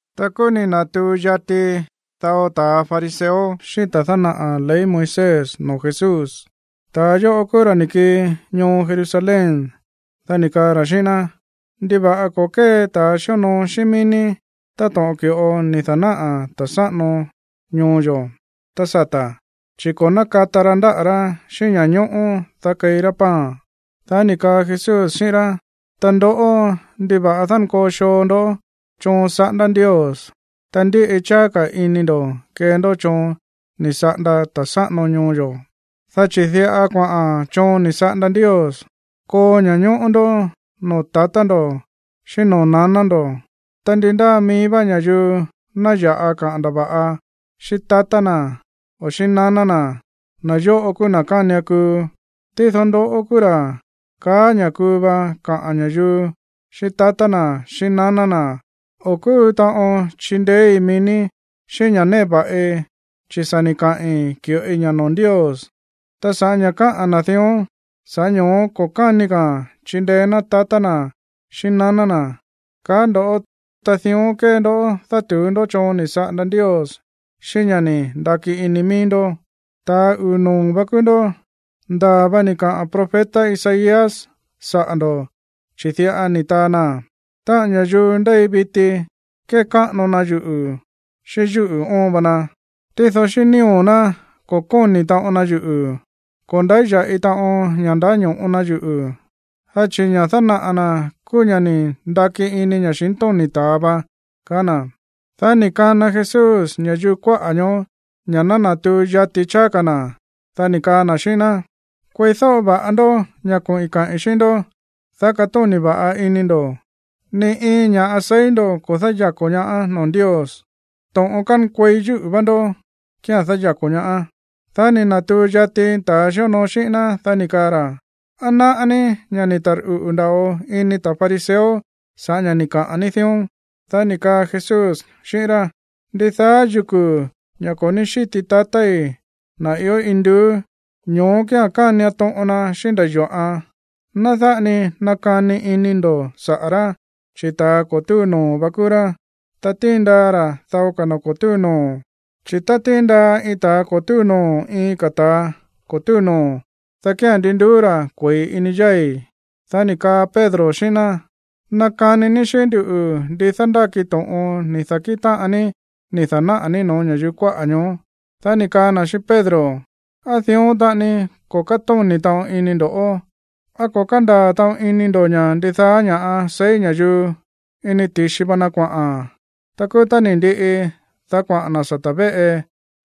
Ta kúú ni̱ na̱tuu yati dao ta̱ fariseo xíꞌín ta̱ dánaꞌa̱ ley Moisés no̱ó Jesús. Ta̱ yóꞌo kúú ra̱ ni̱ kii ñoo Jerusalén. Dá ni̱ kaa ra̱ xíꞌín ná: ―¿Ndiva̱ꞌa ko̱ kée ta̱ xíonoo xíꞌín mií ní táto̱ꞌon ki̱ꞌo ni̱ da̱náꞌa̱ ta̱ sáꞌano ñoo yo̱ tá sata̱? Chi̱ ko̱ nákata ra ndáꞌa̱ rá xíꞌín ña̱ñóꞌó, dá keí rá pan. Dá ni̱ kaa Jesús xíꞌín rá: ―Ta ndoꞌó, ¿ndiva̱ꞌa dánkoo xoo ndó choon saꞌándá Ndios, ta ndíꞌi cháá ka̱ ini ndo̱ kee ndó choon ni̱ saꞌanda ta̱ sáꞌano ñoo yo̱? Dá chi̱ diꞌa kuaꞌa̱n choon ni̱ saꞌanda Ndios: “Koo ña̱ñóꞌó ndó noo̱ tatá ndo̱ xíꞌín noo̱ naná ndo̱”, ta “Ndi ndáa mií vá ña̱yuu ná ya̱ꞌa kaꞌa̱n ndava̱ꞌa xíꞌín tatá na̱ o xíꞌín naná na̱, na̱ yóꞌo kúú na̱ kánian kuu.” Tído ndoꞌó kúú ra̱ kaá ña̱ kuu va kaꞌa̱n ña̱yuu xíꞌín tatá na̱, xíꞌín naná na̱: “O̱ kúu taꞌon chindeéí mií ní xíꞌín ña̱ꞌa néꞌe va̱ꞌi, chi̱ sa̱ ni̱ kaai̱ ki̱ꞌoi ña̱ noo̱ Ndios.” Ta sa̱ꞌá ña̱ káꞌa̱n na̱ dión, sa̱ꞌá ño̱ó ko̱ káni ka̱a̱n chindeé ná tatá na̱ xíꞌín naná na̱, kaá ndo̱ꞌó. Ta dión kée ndó dátu̱ú ndó choon ni̱ saꞌanda Ndios xíꞌín ña̱ ni̱ ndaki ini mií ndó. ’¡Ta̱a uu̱ noo̱ vá kúú ndó! Ndaa̱ va ni̱ kaꞌa̱n profeta Isaías saꞌa̱ ndo̱, chi̱ diꞌa ni̱ taa na: Táꞌa̱n ña̱yuu ndéi viti kékáꞌano na yuꞌu̱ xíꞌín yúꞌu̱ oon va na, tído xíꞌín nío̱ ná ko̱ kóni̱ taꞌon na yuꞌu̱. Ko̱ ndáya̱ꞌi taꞌon ña̱ ndáño̱ꞌo na yuꞌu̱, dá chi̱ ña̱ dánaꞌa̱ na̱ kúú ña̱ ni̱ ndaki ini ña̱xintóni̱ ta̱a va. Dá ni̱ kana Jesús ña̱yuu kuáꞌa̱ ñoó ña̱ ná natuu yati cháá ka̱ na̱, dá ni̱ kaa na̱ xíꞌín ná: ―Kueídóꞌo va̱ꞌa ndó ña̱ koꞌi̱n kaꞌi̱n xíꞌín ndó, dá katóni̱ va̱ꞌa ini ndo̱. Ni iin ña̱ꞌa seí ndo̱ ko̱ dáyako̱ ñaá noo̱ Ndios. To̱ꞌon kánkuei yúꞌu̱ vá ndó kía̱n dáyako̱ ñaá. Dá ni̱ na̱tuu yati ta̱a xíonoo xíꞌín ná, dá ni̱ kaa ra̱: ―¿Á náꞌá ní ña̱ ni̱ tarꞌuꞌu̱ nda̱ꞌo ini ta̱ fariseo sa̱ꞌá ña̱ ni̱ kaꞌa̱n ní dión? Dá ni̱ kaa Jesús xíꞌín rá: ―Ndidaá yuku̱, ña̱ ko̱ ní xíti tatái̱, na̱ ió induú, ñoó kía̱n kánian toꞌon na xíꞌín nda̱ yo̱ꞌan. Ná dáꞌa ni nakani ini ndo̱ saꞌa̱ rá, chi̱ ta̱a ko̱ túu noo̱ vá kúú rá, ta tíin ndaa ra̱ dao ka̱ na̱ ko̱ túu noo̱. Chi̱ tá tíin ndaa iin ta̱a ko̱ túu noo̱ iin ka̱ ta̱ ko̱ túu noo̱, dá kía̱n ndi nduú ra̱ kue̱i ini yái̱. Dá ni̱ kaa Pedro xíꞌín ná: ―Nakani ní xíꞌín nduꞌu̱ ndi dándáki to̱ꞌon ni̱ da̱kíꞌin táꞌan ní ni̱ da̱náꞌa̱ ní no̱ó ña̱yuu kuáꞌa̱ ñoó. Dá ni̱ kaa na̱ xíꞌín Pedro: ―¿Á dión taꞌani ko̱ kátóni̱ taꞌon ini ndo̱ꞌó? ¿Á ko̱ kándaa̱ taꞌon ini ndo̱ ña̱ ndidaá ña̱ꞌa seí ña̱yuu, ini ti̱xi va na kuaꞌa̱n? Tá kúú tá ni̱ ndiꞌi, dá kuaꞌa̱n na̱ sata̱ véꞌe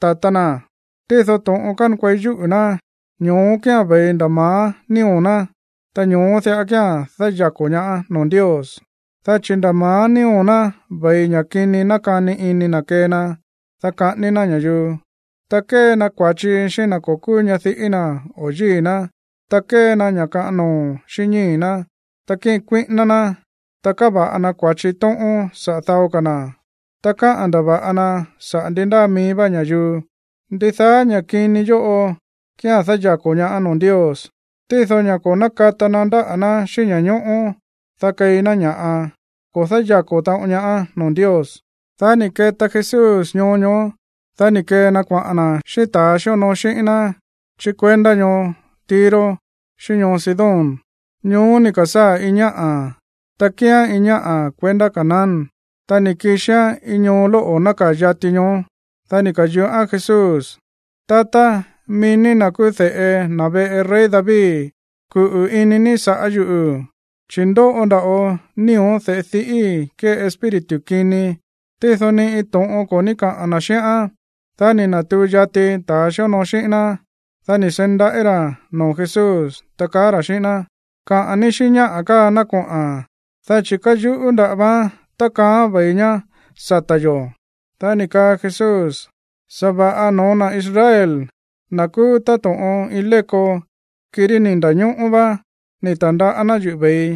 tatá náa̱n. Tído to̱ꞌon kánkuei yúꞌu̱ ná, ño̱ó kía̱n ve̱i nda̱ ma̱á nío̱ ná, ta ño̱ó diꞌa kía̱n dáyako̱ ñaá noo̱ Ndios. Dá chi̱ nda̱ ma̱á nío̱ ná ve̱i ña̱ kini nákani ini na̱ kee na, dá kaꞌání ná ña̱yuu, ta kée na kua̱chi xíꞌín na̱ ko̱ kúú ñadiꞌí na̱ o̱ yíi̱ ná, ta kée na ña̱ kaꞌan noo̱ xíꞌín ñíi̱ ná, ta kíꞌin kuíꞌíná ná, ta káva̱ꞌa na kua̱chi tóꞌón saꞌa̱ dao ka̱ na̱, ta káꞌa̱n ndava̱ꞌa na saꞌa̱ ndi ndáa mií vá ña̱yuu. Ndidaá ña̱ kini yóꞌo kía̱n dáyako̱ ñaá noo̱ Ndios. Tído ña̱ ko̱ nákata na ndáꞌa̱ ná xíꞌín ña̱ñóꞌó, dá keí ná ña̱ꞌa, ko̱ dáyako̱ taꞌon ñaá noo̱ Ndios. Dá ni̱ keta Jesús ñoo ñoó, dá ni̱ kee na kuaꞌa̱n na̱ xíꞌín ta̱a xíonoo xíꞌín ná chí kuendá ñoo Tiro xíꞌín ñoo Sidón. Ñoó ni̱ ka̱sáa̱ iin ñáꞌa̱, ta kíán iin ñáꞌa̱ kuendá Canaán. Ta ni̱ kixián iin ñoo lóꞌo̱ nákaa̱ yati ñoó. Dá ni̱ ka̱yuꞌán Jesús: ―Tatá, mií ní na̱ kúú de̱ꞌe na̱ veꞌe rey David, kuꞌu̱ ini ní sa̱ꞌá yuꞌu̱, chi̱ ndóꞌo nda̱ꞌo nío̱ de̱ꞌe diꞌíi̱ kée iin espíritu kini. Tído ni iin to̱ꞌon ko̱ ní kaꞌa̱n na̱ xíꞌán. Dá ni̱ na̱tuu yati ta̱ xíonoo xíꞌín ná. Dá ni̱ seí ndaꞌí ra̱ noo̱ Jesús, ta kaá ra̱ xíꞌín ná: ―Kaꞌa̱n ní xíꞌín ñáꞌa̱ káa ná koꞌa̱n, dá chi̱ káyuꞌú nda̱ꞌa vaán tákaaán ve̱i ñá sata̱ yo̱. Dá ni̱ kaa Jesús: ―Sa̱va̱ꞌa no̱ó na̱ Israel, na̱ kúú táto̱ꞌon iin léko, kirí ni̱ nda̱ñóꞌó vá, ni̱ ta̱ndaꞌá Ndios yuꞌu̱ ve̱ii.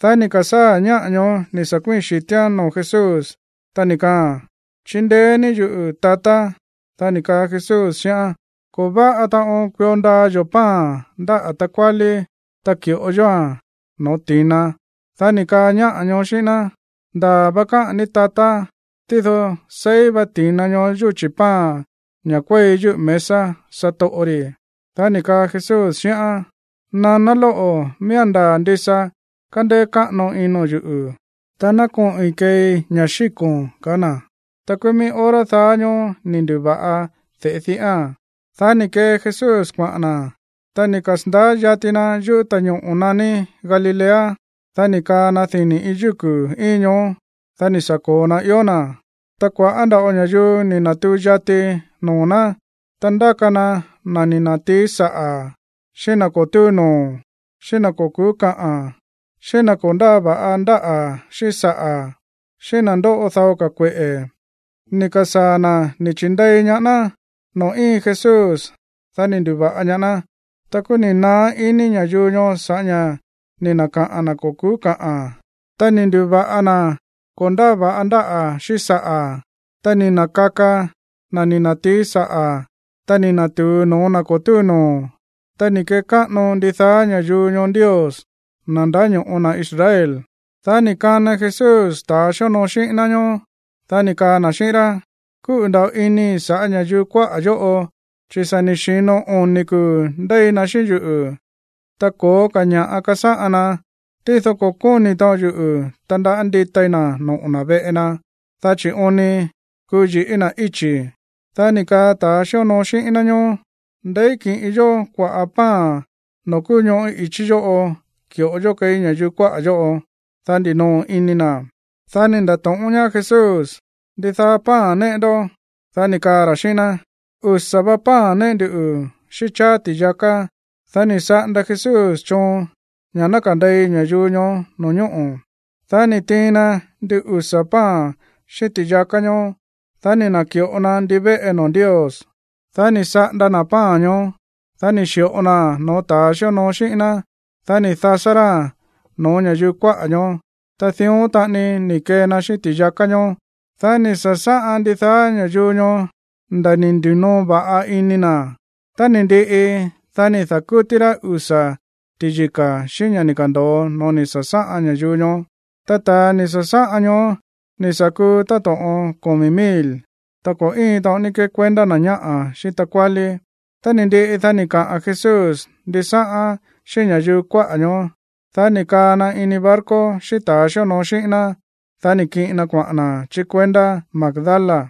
Dá ni̱ ka̱sáa̱ ñáꞌa̱ ñoó ni̱ sa̱ kuíi̱n xi̱tíán noo̱ Jesús, ta ni̱ kaaa̱n: ―¡Chindeé ní yuꞌu̱, tatá! Dá ni̱ kaa Jesús xíꞌán: ―Ko̱ váꞌa taꞌon kuio ndaa yo̱ pan ndáꞌa̱ takuálí, ta ki̱ꞌo yóa̱n no̱ó ti̱na. Dá ni̱ kaa ñáꞌa̱ ñoó xíꞌín ná: ―Ndaa̱ va káꞌa̱n ní, tatá. Tído seí va ti̱na ñoó yúchi̱ pan ña̱ kuéi yúꞌu̱ mesa satoꞌo ri̱. Dá ni̱ kaa Jesús xíꞌán: ―Naná lóꞌo̱, miía̱n ndaa̱ ndisa kándéé káꞌano ino̱n yuꞌu̱. Ta ná koꞌi̱n keei ña̱ xíko̱n ―kaá na̱. Ta kúú mií hora daá ñóó ni̱ ndu̱va̱ꞌa de̱ꞌe diꞌáa̱n. Dá ni̱ kee Jesús kuaꞌa̱n na̱. Tá ni̱ kasa̱ndaá yati na yúꞌu̱ ta̱ñoꞌo̱ naní Galilea, dá ni̱ kaa na dini̱ iin yúku̱ íin ñoó. Dá ni̱ sa̱ ko̱o na ió na̱. Ta kua̱ꞌá nda̱ꞌo ña̱yuu ni̱ na̱tuu yati noo̱ ná, ta ndáka na na̱ ni̱ na̱tií saꞌa̱, xíꞌín na̱ ko̱ túu noo̱, xíꞌín na̱ ko̱ ku̱ú káꞌa̱n, xíꞌín na̱ ko̱ ndáa va̱ꞌa ndáꞌa̱ xíꞌín saꞌa̱, xíꞌín na̱ ndóꞌo dao ka̱ kueꞌe̱, ni̱ ka̱sáa̱ na̱ ni̱ chi̱ndei ñaá ná noo̱ íin Jesús. Dá ni̱ ndu̱va̱ꞌa ñaá ná. Ta kúú ni̱ naá ini ña̱yuu ñoó sa̱ꞌá ña̱ ni̱ na̱kaꞌa̱n na̱ ko̱ ku̱ú kaꞌa̱n, ta ni̱ ndu̱va̱ꞌa na̱ ko̱ ndáa va̱ꞌa ndáꞌa̱ xíꞌín saꞌa̱, ta ni̱ na̱kaka na̱ ni̱ na̱tií saꞌa̱, ta ni̱ na̱tu̱u noo̱ na̱ ko̱ túu noo̱. Ta ni̱ kekáꞌano ndidaá ña̱yuu ñoó Ndios, na̱ ndáño̱ꞌo na̱ Israel. Dá ni̱ kana Jesús ta̱a xíonoo xíꞌín ná ñóó. Dá ni̱ kaa na̱ xíꞌín rá: ―Kúꞌu̱ nda̱ꞌo inii̱ sa̱ꞌá ña̱yuu kuáꞌa̱ yóꞌo chi̱ sa̱ ni̱ xi̱no oni̱ kuu̱ ndéi na xíꞌín yuꞌu̱, ta ko̱ó ka̱ ña̱ꞌa kasáꞌan ná. Tído ko̱ kóni̱ taꞌon yuꞌu̱ tandaꞌá nditai na̱ noꞌo̱ veꞌe na, dá chi̱ oon ni kuu yi̱ꞌí na̱ íchi̱. Dá ni̱ kaa ta̱ xíonoo xíꞌín ná ñóó: ―¿Ndeí kiꞌin yó kuaꞌa̱ pan noo̱ kúú ñoꞌó i̱chí yóꞌo ki̱ꞌo yó keí ña̱yuu kuáꞌa̱ yóꞌo, dá ndinoo ini na̱? Dá ni̱ nda̱to̱ꞌón ñaá Jesús: ―¿Ndidaá pan néꞌe ndó? Dá ni̱ kaa ra̱ xíꞌín ná: ―Usa̱ va pan néꞌe nduꞌu̱, xíꞌín cháá ti̱yaká. Dá ni̱ saꞌanda Jesús choon ña̱ ná kande̱i ña̱yuu ñoó no̱ñóꞌo̱. Dá ni̱ tiin na ndin usa̱ pan xíꞌín ti̱yaká ñoó. Dá ni̱ na̱ki̱ꞌo na ndivéꞌe noo̱ Ndios. Dá ni̱ saꞌanda na̱ pan ñoó. Dá ni̱ xi̱ꞌo naa̱n no̱ó ta̱ xíonoo xíꞌín ná. Dá ni̱ dasá ráa̱n no̱ó ña̱yuu kuáꞌa̱ ñoó. Ta dión taꞌani ni̱ kee na xíꞌín ti̱yaká ñoó. Dá ni̱ sa̱sáꞌan ndidaá ña̱yuu ñoó nda̱ ni̱ ndi̱noo va̱ꞌa ini na̱. Tá ni̱ ndiꞌi, dá ni̱ da̱kútí rá usa̱ ti̱yika̱ xíꞌín ña̱ ni̱ ka̱ndo̱o no̱ó ni̱ sa̱sáꞌan ña̱yuu ñoó. Ta ta̱a ni̱ sa̱sáꞌan ñoó ni̱ sa̱ kuu táto̱ꞌon komi̱ mil, ta ko̱ íin taꞌon ní kekuendá na̱ ñáꞌa̱ xíꞌín takuálí. Tá ni̱ ndiꞌi, dá ni̱ kaꞌa̱n Jesús ndisáꞌán xíꞌín ña̱yuu kuáꞌa̱ ñoó. Dá ni̱ kaa na ini barco xíꞌín ta̱a xíonoo xíꞌín ná. Dá ni̱ kiꞌin na kuaꞌa̱n na̱ chí kuendá Magdala.